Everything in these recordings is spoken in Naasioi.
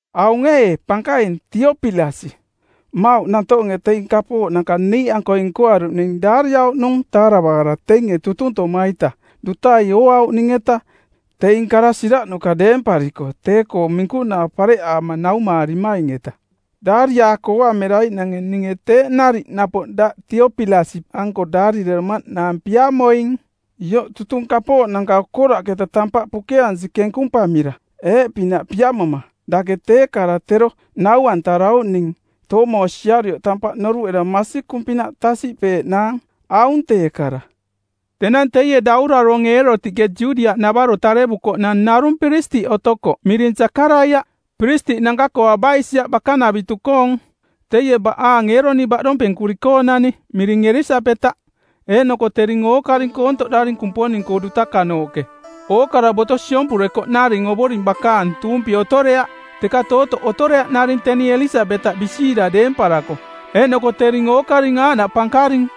Aung ee, pankaing, Teopilasiꞌ; Mmauꞌ nantoonge teing kapooꞌnanka niiꞌankoi nkoaruꞌning daariauꞌnung taaravaara teinge tutuntoma-ita dutai ooauꞌning-eta teing kara siraꞌnuka deempariko tee-koong minkunaa pareꞌaama naumaarimaing-eta; Daariaako ooamiraiꞌnange ninge teeꞌ nariꞌ napoꞌ daꞌ Teopilasiꞌanko daarireromaꞌnaang piamoing, ioꞌ tutung kapooꞌnanka okoraꞌketa, tampaꞌ pukeansi kenkumpamira˜; Eeꞌpinaꞌ piamoma, dake tee kara tero nau-antarauꞌning toomosiarioꞌ tampaꞌ noruꞌera masikung-pinaꞌ tasiꞌpeeꞌnaang. Aung tee kara. Tenang teie dauraronge˜ Eerotiꞌke Judiaꞌnavaro tarevukoꞌnang narung piristiꞌ otokoꞌ miring Sakaraiaꞌ, piristiꞌnanka-koo Abaisiaꞌ bakanavitu-koong. Teie baꞌaang Eeroni baꞌdompenkuri-koonani, miring Elisabetaꞌ. Eeꞌnoko tering ookaring koontoꞌdaring Kumponing-koo dutakanooꞌke, ookara boto siompurekoꞌnaring Ovoring bakaang, tuumpi otoreaꞌ. Teka tootoꞌ otoreaꞌnaring teni Elisabetaꞌ bisiira deemparako, eeꞌnoko tering ookaring aaꞌnaꞌ pankaring.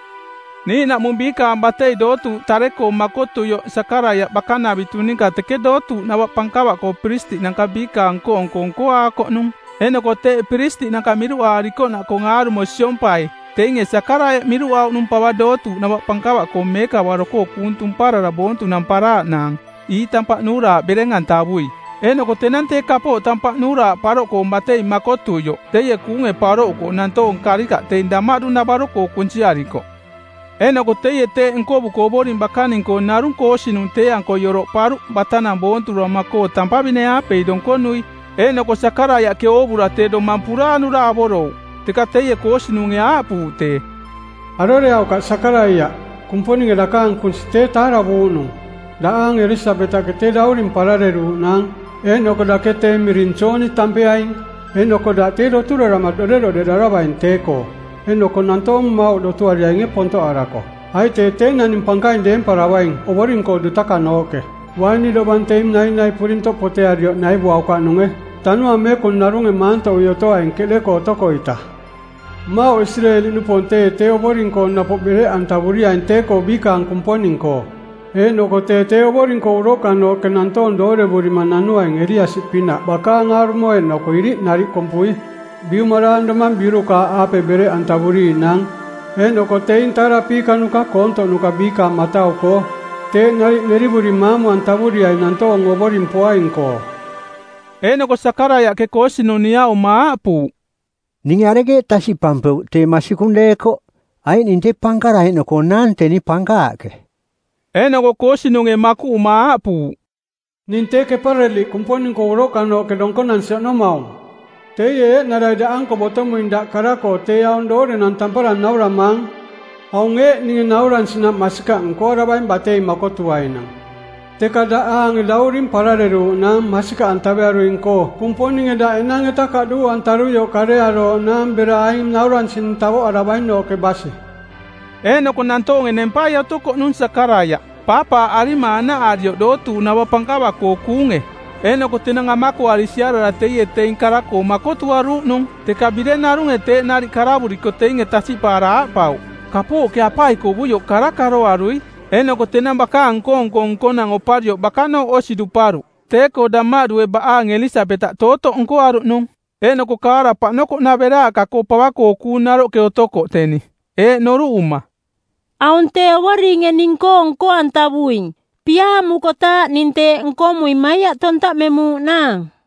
Niiꞌnaꞌmung biikaang batei dootuuꞌ tare-koong makotuioꞌ Sakaraiaꞌ bakanavitu ninka teke dootuuꞌnava pankava-koo piristiꞌnanka biikaang nko-nko nkoaakoꞌnung. Eeꞌnoko teeꞌ piristiꞌnanka miruꞌaarikoꞌnaꞌkoong aarumo siompai, teinge Sakaraiaꞌ miruꞌauꞌnung pava dootuuꞌnava pankava-koo meekavaro-koo kuung tumparara boontunamparaaꞌnaang ii tampaꞌ nuuraaꞌ bereng-antavui. Eeꞌnoko tenang tee kapooꞌ tampaꞌ nuuraaꞌ paroꞌkoong batei makotuioꞌ teie kuunge paroꞌuko nantoong karikaꞌ teing damaꞌdu-navaro-koo kunsiarikoꞌ. Eeꞌnoko teie teeꞌ nkovuko Ovoring bakaning-koo narung koosinung˜ tee-ankoi oroꞌparuꞌ batanang boonturoma-koo tampavine-aapei donkonui. Eeꞌnoko Sakaraiaꞌke oovura tee domang puraanura avorouꞌ. Teka teie koosinunge aaꞌpuuꞌ tee, “Aroreaukaꞌ Sakaraiaꞌ. Kumponinge dakaang kunsi tee taaravuuꞌnung. Daꞌaange Elisabetaꞌke tee dauring parareruuꞌnaang, eeꞌnoko dake tee miring Jooni tampeaing. Eeꞌnoko daꞌ tee doturarama doꞌderoꞌdeꞌdaravaing tee-koo, eeꞌnoko nantoong mmauꞌ dotuariainge pontoꞌarako. Aiꞌ tee tee naning pankaing deemparavaing Ovoring-koo dutakanooꞌke. Uaini dovang teing nainai purintoꞌ potearioꞌ naivuaukaꞌnunge. Tanuaang Meekung narunge maantoꞌui otoaing keꞌde-koo otoko-ita. Mmauꞌ Isireeli-nupoong teie tee Ovoring-koo napoꞌ bereꞌantavuriaing tee-koo biikaang Kumponing-koo. Eeꞌnoko tee tee Ovoring-koo uroꞌkanooꞌke nantoong doorevurima nanuaing Eliasi-pinaꞌ bakaang aarumo eeꞌnoko iriꞌ nariꞌ kompui. Biumaraang domang biurukaaꞌaape bereꞌantavuriiꞌnaang eeꞌnoko teing taarapiikanuka koontoꞌnuka biikaang matau-koo. Teeꞌ nariꞌ nerivuri maamu-antavuriaing nantoong Ovoring poaing-koo.” Eeꞌnoko Sakaraiaꞌke koosinung niaꞌuma aaꞌpuuꞌ, “Ninge arekeeꞌ tasiꞌpampeuꞌ tee masikung deekoꞌ? Aiꞌ ning tee pankara eeꞌnoko nnaang teni pankaaꞌke.” Eeꞌnoko koosinunge makuꞌuma aaꞌpuuꞌ, “Ning tee Kepareliꞌ Kumponing-koo uroꞌkanooꞌke donkonansi oꞌnomaung. Teie eeꞌnarai ning daꞌanko botomuing daꞌ kara-koo tee aung doorenang tampara nauramaang. Aung ee, ninge nauransinaꞌ masikaꞌ nkoaravaing batei makotuainang, teka daꞌaange dauring parareruuꞌnaang masikaꞌantavearuing-koo Kumponinge daꞌ enang-eta kaꞌduu-antaruioꞌ karearooꞌnaang bera aing nauransining tavoꞌaravainooꞌke basi.” Eeꞌnoko nantoonge nempai otokoꞌnung Sakaraiaꞌ, paapaaꞌarima anaꞌarioꞌ dootuuꞌnava pankava-koo kuunge. Eeꞌnoko tenang amakoari siarara teie teing kara-koo makotuaruuꞌnung, teka bireng narunge teeꞌ nariꞌ karavuriko teinge tasiꞌpaara aaꞌpauꞌ, “Kapooꞌke apaikovuioꞌ kara karoarui.” Eeꞌnoko tenang bakaang nko-nko nkonang oparioꞌ bakanooꞌ osi duparuꞌ. Tee-koo damaꞌdue baꞌaang Elisabetaꞌ tootoꞌ nkoaruꞌnung, eeꞌnoko kaara paꞌnokoꞌnaveraaꞌka-koo pava-koo kuung naroꞌke otokoꞌ teni, eeꞌ noruꞌuma: Aung tee Ovoringe ning-koo nko-antavuing; piaamukotaaꞌ ning teeꞌ nkomuing maiaꞌ tontaꞌmemuuꞌnaang.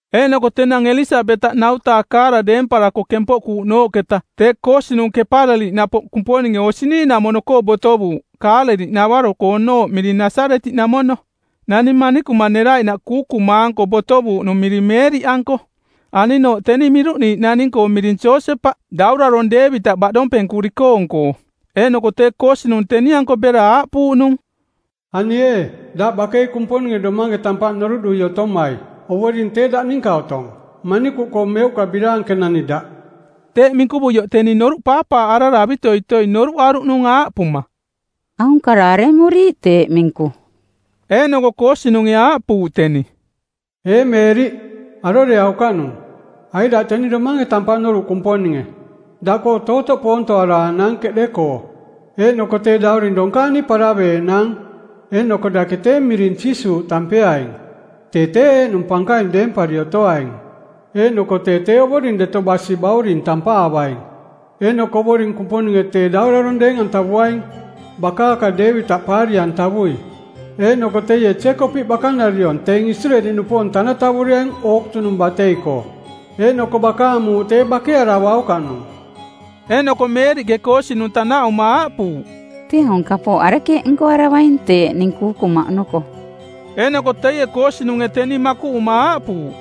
Eeꞌnoko tenang Elisabetaꞌ ˜nau-taa kaara deemparako kempoꞌkuuꞌnooꞌketa tee koosinung Kepareliꞌ napoꞌ Kumponinge osi niiꞌnamono-koo botovuuꞌ Kaaleliꞌnavaro-koonooꞌ miring Nasaretiꞌnamono. Nani manikuma neraiꞌnaꞌ kuukuma˜anko botovuuꞌnung miring Meeriꞌanko. Aninooꞌ teni miruꞌniiꞌ naning-koo miring Josepaꞌ, Daurarong˜ Deevitaꞌ baꞌdompenkuri-koong-koo. Eeꞌnoko tee koosinung teni-anko bera aaꞌpuuꞌnung, “Ani ee, daꞌ bakei Kumponinge domange tampaꞌ noruꞌdui otomai. Ovoring tee daꞌ ninka otong. Manikuꞌkoo meuꞌka biraankenani daꞌ.” Teeꞌ minkuvuioꞌ teni noruꞌ paapaaꞌarara avitoitoi noruꞌaruꞌnung aaꞌpuma, “Aung kara aremuriiꞌ teeꞌ minku?” Eeꞌnoko koosinunge aaꞌpuuꞌ teni, “Ee Meeriꞌ, aroreaukaꞌnung, aiꞌ daꞌ teni domange tampaꞌ noruꞌ Kumponinge. Daꞌkoo tootoꞌ poontoaraaꞌnaang˜ keꞌde-koo, eeꞌnoko tee dauring donkaani paraveeꞌnaang, eeꞌnoko dake tee miring Jiisuuꞌ tampeaing. Tee tee eeꞌnung pankaing deempari otoaing eeꞌnoko tee tee Ovoring Deto Basi Bauring tampaavaing. Eeꞌnoko Ovoring Kumponinge tee Daurarong deeng-antavuaing bakaaka Deevitaꞌ paari-antavui. Eeꞌnoko teie Jeekopiꞌ bakanariong, teing Isireeli-nupoong tanatavuriaing ookutunung batei-koo, eeꞌnoko bakaang muuꞌ tee bakearavaukaꞌnung.” Eeꞌnoko Meeriꞌke koosinung tanaꞌuma aaꞌpuuꞌ, “Tee aung kapooꞌ arekeeꞌ nkoaravaing teeꞌ ning kuukuma oꞌnoko?” Eeꞌnoko teie koosinunge teni makuꞌuma aaꞌpuuꞌ,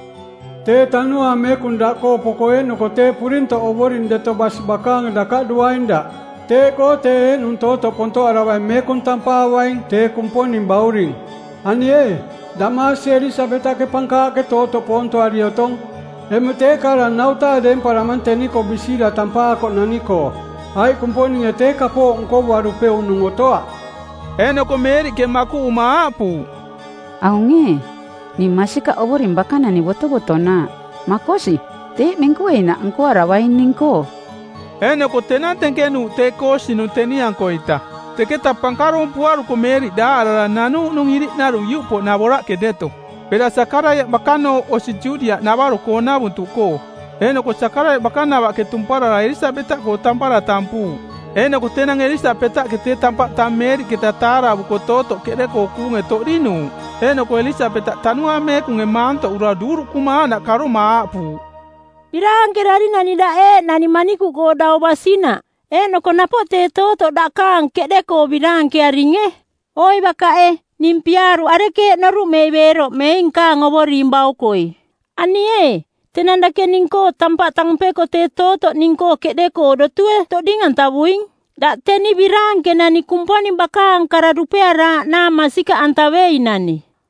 “Tee Tanuaang Meekung daꞌkoo poko eeꞌnoko tee purintoꞌ Ovoring Deto Basi bakaange dakaꞌduaing daꞌ. Teeꞌkoo tee eeꞌnung tootoꞌ pontoꞌaravaing meekung tampaavaing, tee Kumponing Bauring. Ani ee, daꞌmaasie Elisabetaꞌke pankaaꞌke tootoꞌ poontoari˜ otong. Emuꞌ tee kaara ˜nau-taa deemparamang teni-koo bisiira tampaakoꞌnani-koo; Aiꞌ Kumponinge tee kapooꞌ nkovuarupeuꞌnung otoaꞌ.” Eeꞌnoko Meeriꞌke makuꞌuma aaꞌpuuꞌ, “Aung ee, ning masikaꞌ Ovoring bakanani botovotonaaꞌ. Makosi, teeꞌ minkueinaꞌ nkoaravaing ning-koo.” Eeꞌnoko tenang tenkenuuꞌ tee koosinung teni-ankoita. Teketaꞌ pankaroompuaruko Meeriꞌ daaꞌarara nanuuꞌnung iriꞌnarung iuꞌpoꞌnavoraꞌke deto bera Sakaraiaꞌ bakanooꞌ osi Judiaꞌnavaro-koonavuntuꞌkoo. Eeꞌnoko Sakaraiaꞌ bakanavaꞌke tumparara Elisabetaꞌkoo tampara tampuuꞌ. Eeꞌnoko tenang Elisabetaꞌke tee tampaꞌ tang Meeriꞌketa taaravuko tootoꞌ keꞌde-koo kuunge toꞌdinuuꞌ; Eeꞌnoko Elisabetaꞌ Tanuaang Meekunge maantoꞌura duuruꞌkuma aaꞌnaꞌ karoma aaꞌpuuꞌ, “Biraankerarinani daꞌ eeꞌnani manikuꞌkoo dau basinaꞌ, eeꞌnoko napoꞌ tee tootoꞌ dakaang keꞌde-koo biraankearinge. Oi bakaꞌe, ning piaaruꞌ arekeeꞌ noruꞌmei beeroꞌmei nkaang Ovoring baukoi? Ani ee, tenang dake ning-koo tampaꞌ tampeko tee tootoꞌ ning-koo keꞌde-koo dotue toꞌding-antavuing. Daꞌ teni biraankenani Kumponing bakaang kara dupearaaꞌnaang masikaꞌantaveinani!”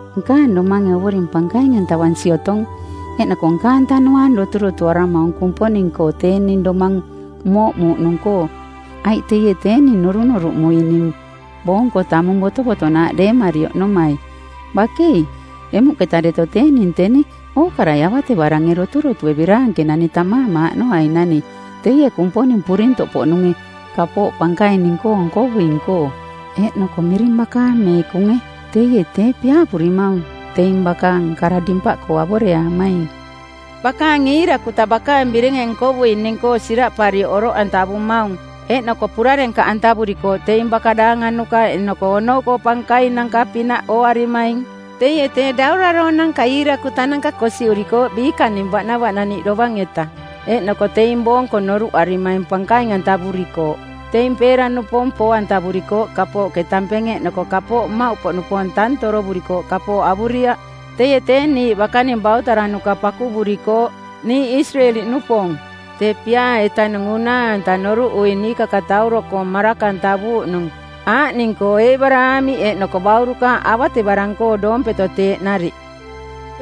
“Nkaang domange Ovoring pankaing-antavansi otong, eeꞌnoko nkaang tanuaang doturotuaramaung Kumponing-koo tee ning domaang mooꞌmuuꞌnung-koo, aiꞌ teie tee ning norunoruꞌmuing ning boonko tamung botovotonaaꞌ deemari oꞌnomai; Bakei, emuꞌketa deto tee ning teni ookarai avatevarange doturotue biraankenani tammaamaaꞌnoainani teie Kumponing Purintoꞌpoꞌnunge kapooꞌ pankaing ning-koo nkovuing-koo; Eeꞌnoko miring bakaang meekunge. Teie tee piaavurimaung teing bakaang kara dimpaꞌkoo avoreaamaing. Bakaang iirakuta bakaang birenge nkovuuꞌning-koo siraꞌparioꞌ oroꞌantavumaung, eeꞌnoko purarenkaꞌantavurikooꞌ teing baka daanganuka eeꞌnoko onou-koo pankainanka-pinaꞌ ooarimaing. Teie tee dauraronanka iirakutananka kosiꞌurikooꞌ biikaning baꞌnavaꞌnaniꞌ dovang-eta, eeꞌnoko teing boong-koo noruꞌarimaing pankaing-antavurikooꞌ. Teing peera-nupoong poo-antavurikooꞌ kapooꞌke tampenge eeꞌnoko kapooꞌ mmauꞌpoꞌnupoong tang torovurikooꞌ kapooꞌ avuriaꞌ. Teie tee niiꞌ bakaning bautaranuka pakuvurikooꞌ, niiꞌ Isireeli-nupoong, tee piaa-etanung unaa-anta noruꞌui niikakatauro-koo maraka-antavuuꞌnung, aaꞌning-koo Eebaraamiꞌ eeꞌnoko baurukaaꞌ avatevarang-koo doompeto teeꞌ nariꞌ.”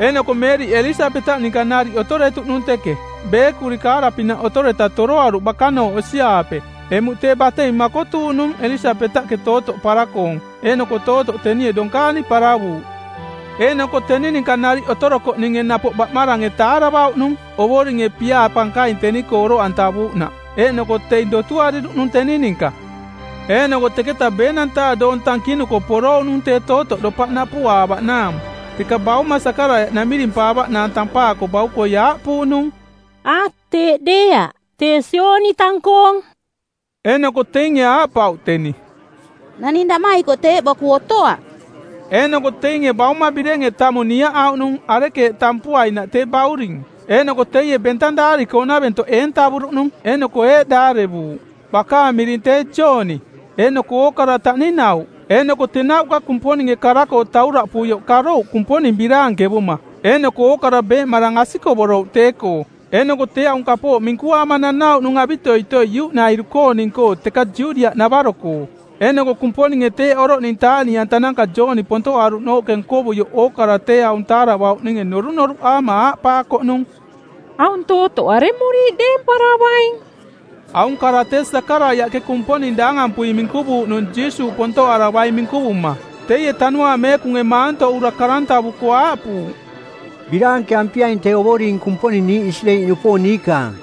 Eeꞌnoko Meeriꞌ Elisabetaꞌ ninka nariꞌ otoretuꞌnung teke. Beekuri kaara-pinaꞌ otoreta toroaruꞌ bakanooꞌ osi-aape. Emuꞌ tee batei makotuuꞌnung Elisabetaꞌke tootoꞌ para-koong eeꞌnoko tootoꞌ tenie donkaani paravuuꞌ. Eeꞌnoko teni ninka nariꞌ otorokoꞌninge napoꞌ baꞌmarange taaravauꞌnung Ovoringe piaa pankaing teni-koo oroꞌantavuuꞌnaꞌ eeꞌnoko teing dotuariruꞌnung teni ninka. Eeꞌnoko teketa ˜beenang-taa doong tankinuko porouꞌnung tee tootoꞌ dopaꞌ napuꞌaavaꞌnaang; Teka bauma Sakaraiaꞌ namirimpaavaꞌnaang tampaako baukoi aaꞌpuuꞌnung, “A, teeꞌ deeaꞌ, tee Jooni tang-koong.” Eeꞌnoko teinge aaꞌpauꞌ teni, “Naning daꞌmaikoꞌ teeꞌ boku otoaꞌ.” Eeꞌnoko teinge bauma birenge tamung niaꞌauꞌnung arekeeꞌ tampuainaꞌ tee bauring. Eeꞌnoko teie bentang daari-koonaventoꞌ eentavuruꞌnung eeꞌnoko eeꞌ daarivuuꞌ, “Bakaang miring tee Jooni.” Eeꞌnoko ookara taꞌninauꞌ. Eeꞌnoko tenauꞌka Kumponinge kara-koo tauraꞌpuioꞌ karouꞌ Kumponing biraankevuma. Eeꞌnoko ookara beeꞌmarang asikovorouꞌ tee-koo eeꞌnoko tee aung kapooꞌ minkuaama nanauꞌnung avitoitoi iuꞌnairu-kooning-koo teka Judiaꞌnavaro-koo. Eeꞌnoko Kumponinge teeꞌ oroꞌning taaꞌniꞌantananka Jooni pontoꞌaruꞌnooꞌke nkovuioꞌ ookarai tee aung taaravauꞌninge norunoruꞌaama aaꞌpaakoꞌnung, “Aung tootoꞌ aremuriiꞌ deemparavaing?” Aung kara tee Sakaraiaꞌke Kumponing daangampui minkuvuuꞌnung Jiisuuꞌ pontoꞌaravaing minkuvuma. Teie Tanuaang Meekunge maantoꞌura karantavuko˜ aaꞌpuuꞌ, “Biraankeampiaing tee Ovoring Kumponing niiꞌ Isireeli-nupoong niikaang,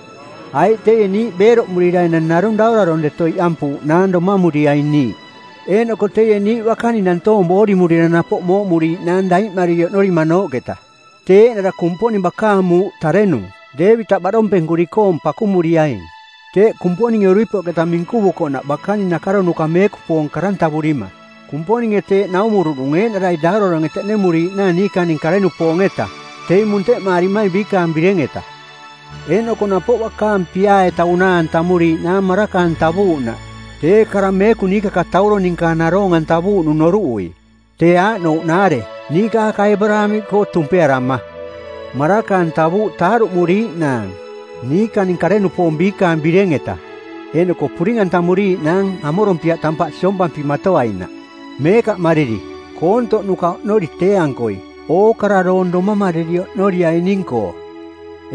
aiꞌ teie niiꞌ beeroꞌmurira enang narung daurarong deto iꞌampuuꞌnaang domamuriaing niiꞌ; Eeꞌnoko teie niiꞌ bakaning nantoong boorimurira napoꞌ mooꞌmuriiꞌnaang daiꞌmariri oꞌnorimanooꞌketa. Tee eeꞌnara Kumponing bakaang muuꞌ tarenung, Deevitaꞌ, baꞌdompenkuri-koong pakumuriaing; Teeꞌ Kumponinge uripoꞌketa minkuvukoꞌnaꞌ bakaning nakaronuka˜ meekupoong karantavurima˜. Kumponinge teeꞌ naumuruꞌnung eeꞌnarai dauraronge teꞌnemuriiꞌnaang niikaning kare-nupoong-etaꞌ, teing munteꞌmaarimaing biikaang bireng-eta. Eeꞌnoko napoꞌ bakaang piaa-eta unaa-antamuriiꞌnaang maraka-antavuuꞌnaꞌ, tee kara meekung niikakatauro ninka naroong-antavuuꞌnung noruꞌui. Tee aaꞌnouꞌnaare: niikaaka Eebaraamiꞌkoo tumpearama˜ maraka-antavuuꞌ taaruꞌmuriiꞌnaang niikaning kare-nupoong biikaang bireng-eta, eeꞌnoko puring-antamuriiꞌnaang amorompiaꞌ tampaꞌ siompampimatoainaꞌ, meekaꞌmariri, koontoꞌnuka oꞌnori tee-ankoi, ookara doong domamariri oꞌnorianing-koo.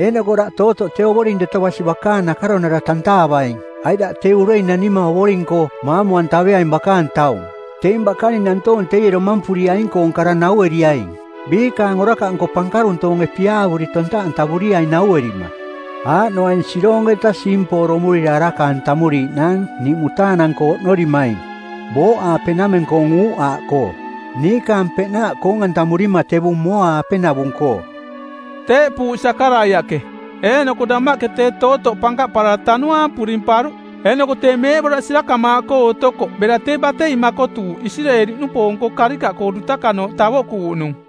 Eeꞌnoko daꞌ tootoꞌ tee Ovoring Deto Basi Bakaang Nakaronara tantaavaing, aiꞌ daꞌ tee urei nanima Ovoring-koo maamu-antaveaing bakaang taung. Teing bakaning nantoong teie domampuriaing-koong kara nau-eriaing biikaang orakaꞌnko pankaruntoonge piaavuri tontaꞌantavuriaing nauerima; Aaꞌnoaing: Siroong-eta siimpooromurira˜ araka-antamuriiꞌnaang niiꞌ mutaanang-koo oꞌnorimaing booꞌaapenameng-koong uuꞌaaꞌkoo, niikaang peꞌnaaꞌ koong-antamurima tevung mooa-aapenavung-koo.” Teeꞌpuuꞌ Sakaraiaꞌke. Eeꞌnoko damaꞌke tee tootoꞌ pankaꞌparara tanuaang purimparuꞌ, eeꞌnoko tee meeꞌboraꞌ sirakamaaꞌkoo otokoꞌ bera tee batei makotuuꞌ Isireeli-nupoong-koo karikaꞌkoo dutakanooꞌ tavoꞌkuuꞌnung.